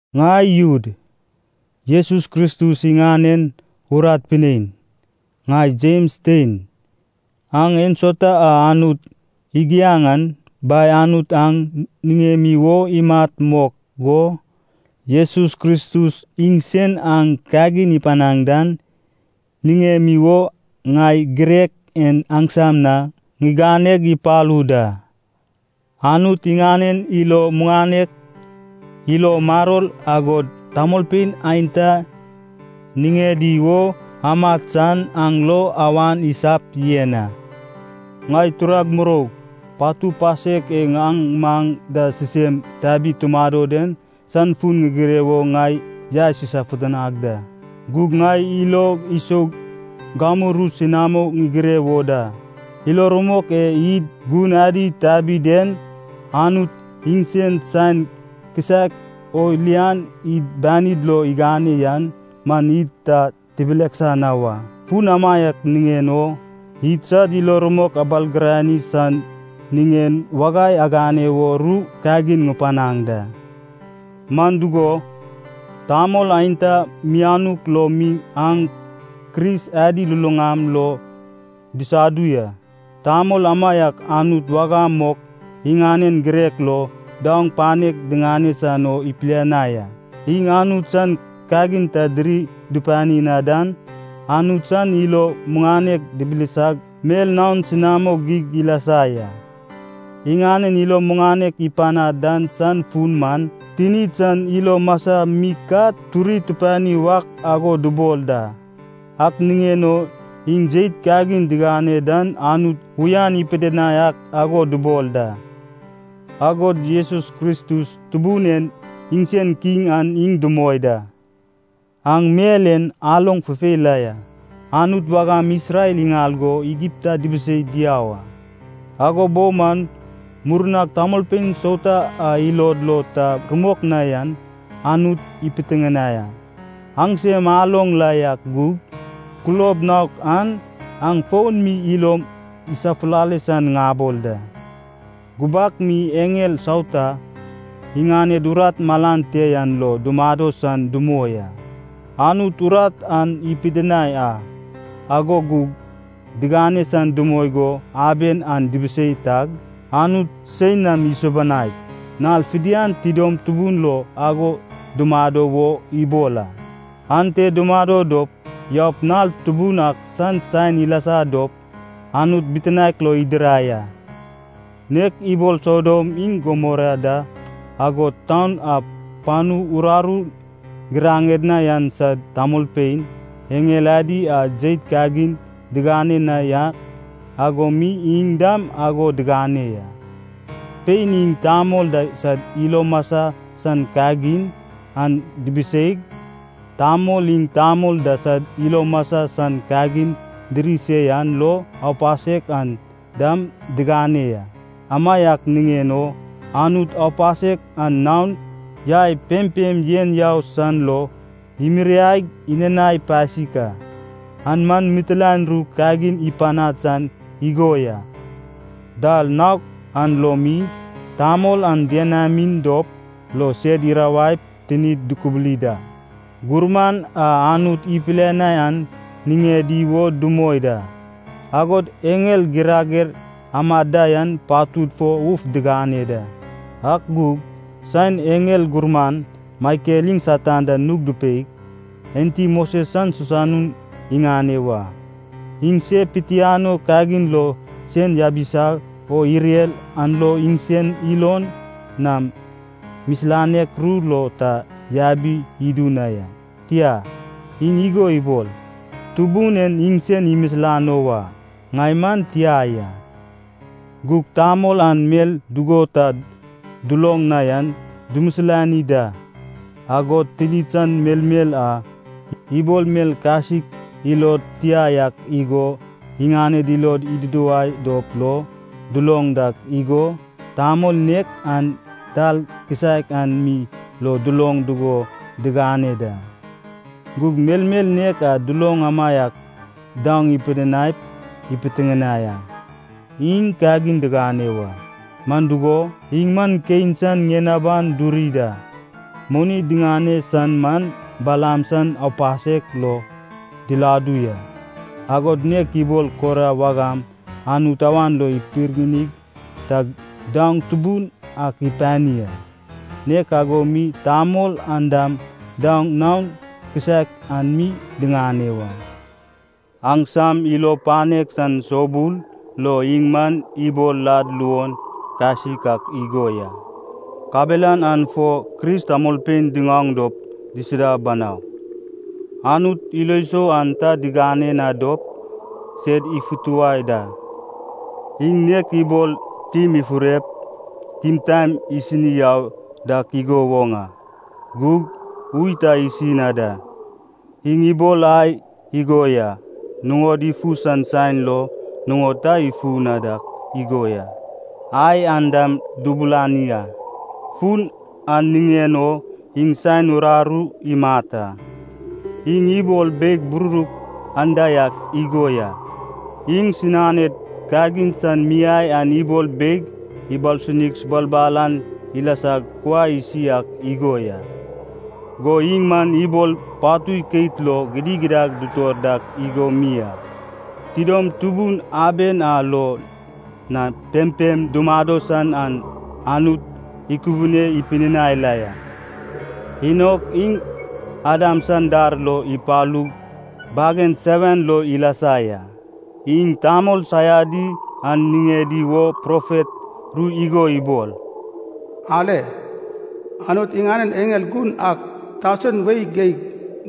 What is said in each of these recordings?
Ŋai Jud, Jesus Kristus iŋanen urat pinein, ŋai Jems tein. Aŋ ensauta a Anut igiaŋ an, Bai Anut aŋ niŋemi wo imat mok go, Jesus Kristus iŋsen aŋ kagin ipanaŋ dan, niŋemi wo ŋai girek en aŋsam na ŋiganeg ipalu da. Anut iŋanen ilo muŋanek, ilo maror agod tamolpein aenta niŋedi wo amat san aŋ lo awan isap yen a. Ŋai turag muroug, patu pasek e aŋ maŋ da sisem tabig tumado den san fun ŋigire wo ŋai yaes isofutanag da. Gug ŋai ilog isoug gamu ru senamo ŋigire wo da. Ilo rumok e id gun adi tabi den, Anut iŋsen saen kisaek o lian id banid lo igane yan man id ta tibileksa na wa. Fun amaiak niŋen o, idsad ilo rumok abalgirani san niŋen wagai agane wo ru kagin ŋupanaŋ da. Man dugo, tamol aenta mianuk lo mi aŋ Kris adi luluŋam lo disadu ya. Tamol amaiak Anut wagam mok, iŋanen girek lo, daoŋ panek diŋane san o ipilianai a. Iŋ Anut san kagin ta diri dupani na dan, Anut san ilo muŋanek dibilisag mel naon senamo geig ilasa ya. Iŋanen ilo muŋanek ipanad dan san fun man, tinid san ilo masa mi ka turi tupani wak ago dubol da. Ak niŋen o iŋ jeit kagin digane dan Anut uyan ipidinai ak ago dubol da. Agod Jesus Kristus, Tubun en iŋsen Kiŋ an iŋ dumoi da. Aŋ mel en aloŋ fufei la ya, Anut wagam Isrel iŋal go Igipta dubiseig diau a. Ago bo man murnag tamolpein sauta a ilod lo ta rumok na yan Anut ipitiŋinai a. Aŋsem aloŋ la yak gug, kulob naok an aŋ fon mi ilom isafulale san ŋabol da. Gubak mi eŋel sauta, iŋaned urat malan te yan lo dumado san dumoi a. Anut urat an ipidinai a, ago gug digane san dumoi go aben an dubisei tag, Anut sein nam isubanaig nal fidian tidom tubun lo ago dumado wo ibol a. Ante dumado dop yaup nal tubun ak san saen ilasa dop Anut bitinaek lo idirai a. Nek ibol Sodom iŋ Gumora da, agod taun a panu uraru giraŋed na yan sad tamolpein, eŋel adi a jeit kagin digane na yak ago mi iŋ dam ago digane ya. Pein iŋ tamol da sad ilo masa san kagin an dibiseig, tamol iŋ tamol da sad ilo masa san kagin diri se yan lo aupasek an dam digane ya. Amaiak niŋen o Anut aupasek an naon yai pempem yen yau san lo imiriaig inanai pasik a, an man mitilaen ru kagin ipanad san igo ya. Dal naok an lo mi, tamol an dienamin dop lo sed irawaip tinid dukubuli da, gurman a Anut ipilianai an niŋedi wo dumoi da, agod eŋel girager amad da yan patud fo uf digane da. Ak gug saen eŋel gurman Maikel iŋ Satan da nug dupei, enti Moses san sisanun iŋane wa, iŋ se pitianoi kagin lo sen yabisa o irer an lo iŋsen ilon nam misilanek ru lo ta yabi idu na ya, tia, iŋ igo ibol, “Tubun en iŋsen imisilano wa, ŋai man tia ya.” Gug tamol an mel dugo ta duloŋ na yan dumisilani da. Agod tinid san melmel a, ibol mel kasik ilod tia yak igo, iŋaned ilod iduduwai dop lo duloŋ dak igo, tamol nek an dal kisaek an mi lo duloŋ dugo digane da. Gug melmel nek a duloŋ amaiak daoŋ ipidinaip ipitiŋinai a. Iŋ kagin digane wa! Man dugo, iŋ man Kein san ŋien aban duri da, moni diŋane san man Balaam san aupasek lo diladu ya, agod nek ibol Kora wagam Anut awan lo ipirgini tag daoŋ tubun ak ipani a, nek ago mi tamol an dam daoŋ naon kisaek an mi diŋane wa. Aŋsam ilo panek san soubul lo iŋ man ibol lad luon kasik ak igo ya. Kabelan an fo Kris tamolpein diŋaoŋ dop disida banau. Anut ilo sou an ta digane na dop sed ifutuwai da. Iŋ nek ibol tim ifurep, timtaen isini yau dak igo woŋ a, gug ui ta isi na da. Iŋ ibol ai igo ya, nuŋodi ifu san saen lo nuŋon ta ifu na dak igo ya, ai an dam dubulani a, fun an niŋen o iŋ saen uraru imat a. Iŋ ibol beig bururuk anda yak igo ya, iŋsinaned kagin san miai an ibol beig ibalsunig sabalbal an ilasag kuai isi ak igo ya. Go iŋ man ibol patui keit lo gidigidad dutor dak igo mi a. Tidom tubun aben a lo na pempem dumado san an Anut ikubune pidinai la ya. Enok, iŋ Adam san dar lo ipalug bagen seven lo ilasa ya, iŋ tamol saiadi an niŋedi wo profet ru igo ibol, “Ale. Anut iŋanen eŋel gun ak tausen wei geig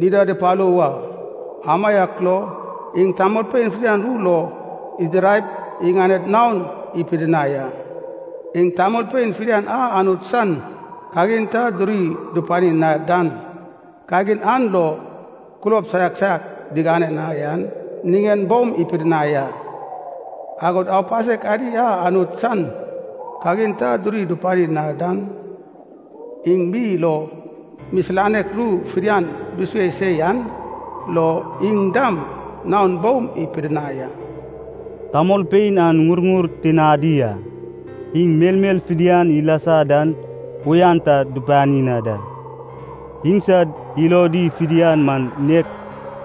dida dupalu wa. Amaiak lo, iŋ tamolpein fidian ru lo idiraip iŋaned naon ipidinai a. Iŋ tamolpein fidian a Anut san kagin ta duri dupani na dan, kagin an lo kulob saiak saiak digane na yan niŋen boum ipidinai a. Agod aupasek adi a Anut san kagin ta duri dupani na dan, iŋ mi lo misilanek ru fidian dusue se yan lo, iŋ dam naon boum ipidinai a.” Tamolpein an ŋurŋur tinadi a, iŋ melmel fidian ilasa dan uyan ta dupani na da. Iŋsad ilodi fidian man nek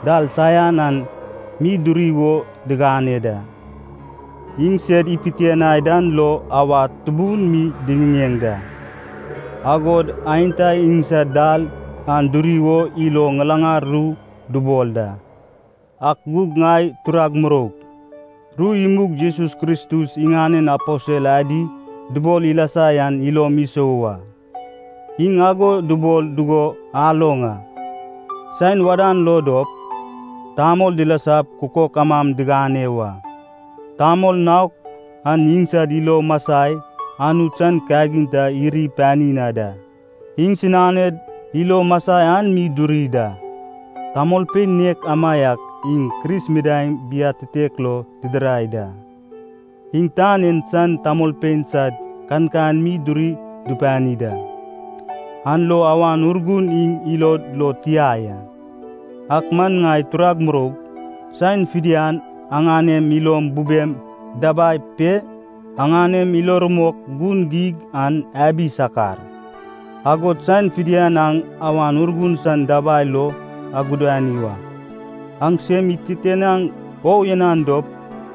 dal saian an mi duri wo digane da. Iŋ sed ipitianai dan lo awad tubun mi diŋiŋeŋ da. Agod aenta iŋsad dal an duri wo ilo ŋilaŋal ru dubol da. Ak gug ŋai turag muroug, ru imug Jesus Kristus iŋanen aposel adi dubol ilasa yan ilom isou wa. Iŋ ago dubol dugo aloŋ a, “Saen wadan lo dop, tamol dilasap kukok amam digane wa. Tamol naok an iŋsad ilo masai Anut san kagin ta iri pani na da. Iŋsinaned ilo masai an mi duri da.” Tamolpein nek amaiak iŋ Kris midaeŋ biatitek lo didirai da. Iŋ tan en san tamolpein sad kankan mi duri dupani da. An lo Awan Urgun iŋ ilod lo tia ya. Ak man ŋai turag muroug, saen fidian aŋanem ilom bubem dabai pe, aŋanem ilo rumok gun geig an abi sakar. Agod saen fidian aŋ Awan Urgun san dabai lo agudani wa. Aŋ sem ititianaŋ o uyanan dop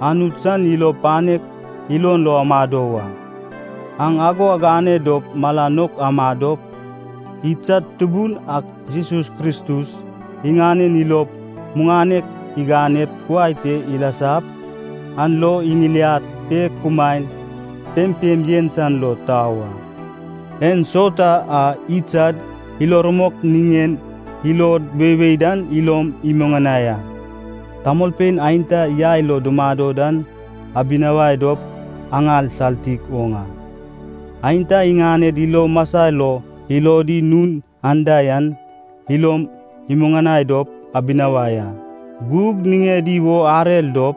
Anut san ilo panek ilon lo amado wa. Aŋ ago agane dop mala nouk amadop, idsad Tubun ak Jesus Kristus iŋanen ilo muŋanek iganep kuai te ilasap, an lo iŋiliad pe kumaen pempem yen san lo tau a. Ensauta a idsad ilo rumok niŋen ilod weiwei dan ilom imuŋanai a. Tamolpein aenta yai lo dumado dan, abinawai dop aŋal saltik oŋ a. Aenta iŋaned ilo masa lo ilodi nun anda yan, ilom imuŋanai dop abinawai a. Gug niŋedi wo arer dop,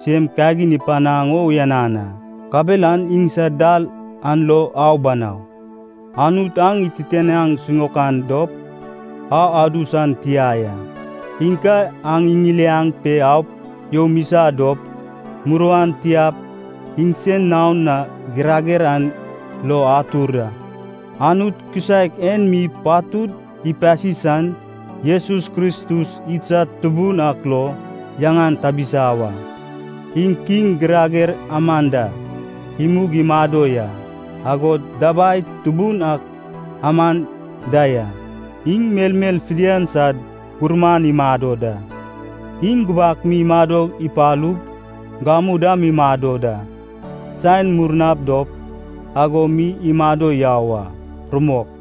sem kagin ipanaŋ o uyanan a, kabelan iŋsad dal an lo au banau. Anut aŋ ititianaŋ siŋaokan dop, au adu san tia ya. Iŋ ka aŋ iŋiliaŋ pe aup youm isa dop, muruan tiap iŋsen naon na girager an lo atur a. Anut kisaek en mi patud ipasi san, Jesus Kristus idsad Tubun ak lo yaŋan tabisa wa. Iŋ Kiŋ girager aman da, imug imado ya. Agod dabai tubun ak aman da ya. Iŋ melmel fidian sad gurman imado da. Iŋ gubak mi imado ipalug, gamu dam mi imado da. Saen murna dop, ago mi imado yau a. Rumok.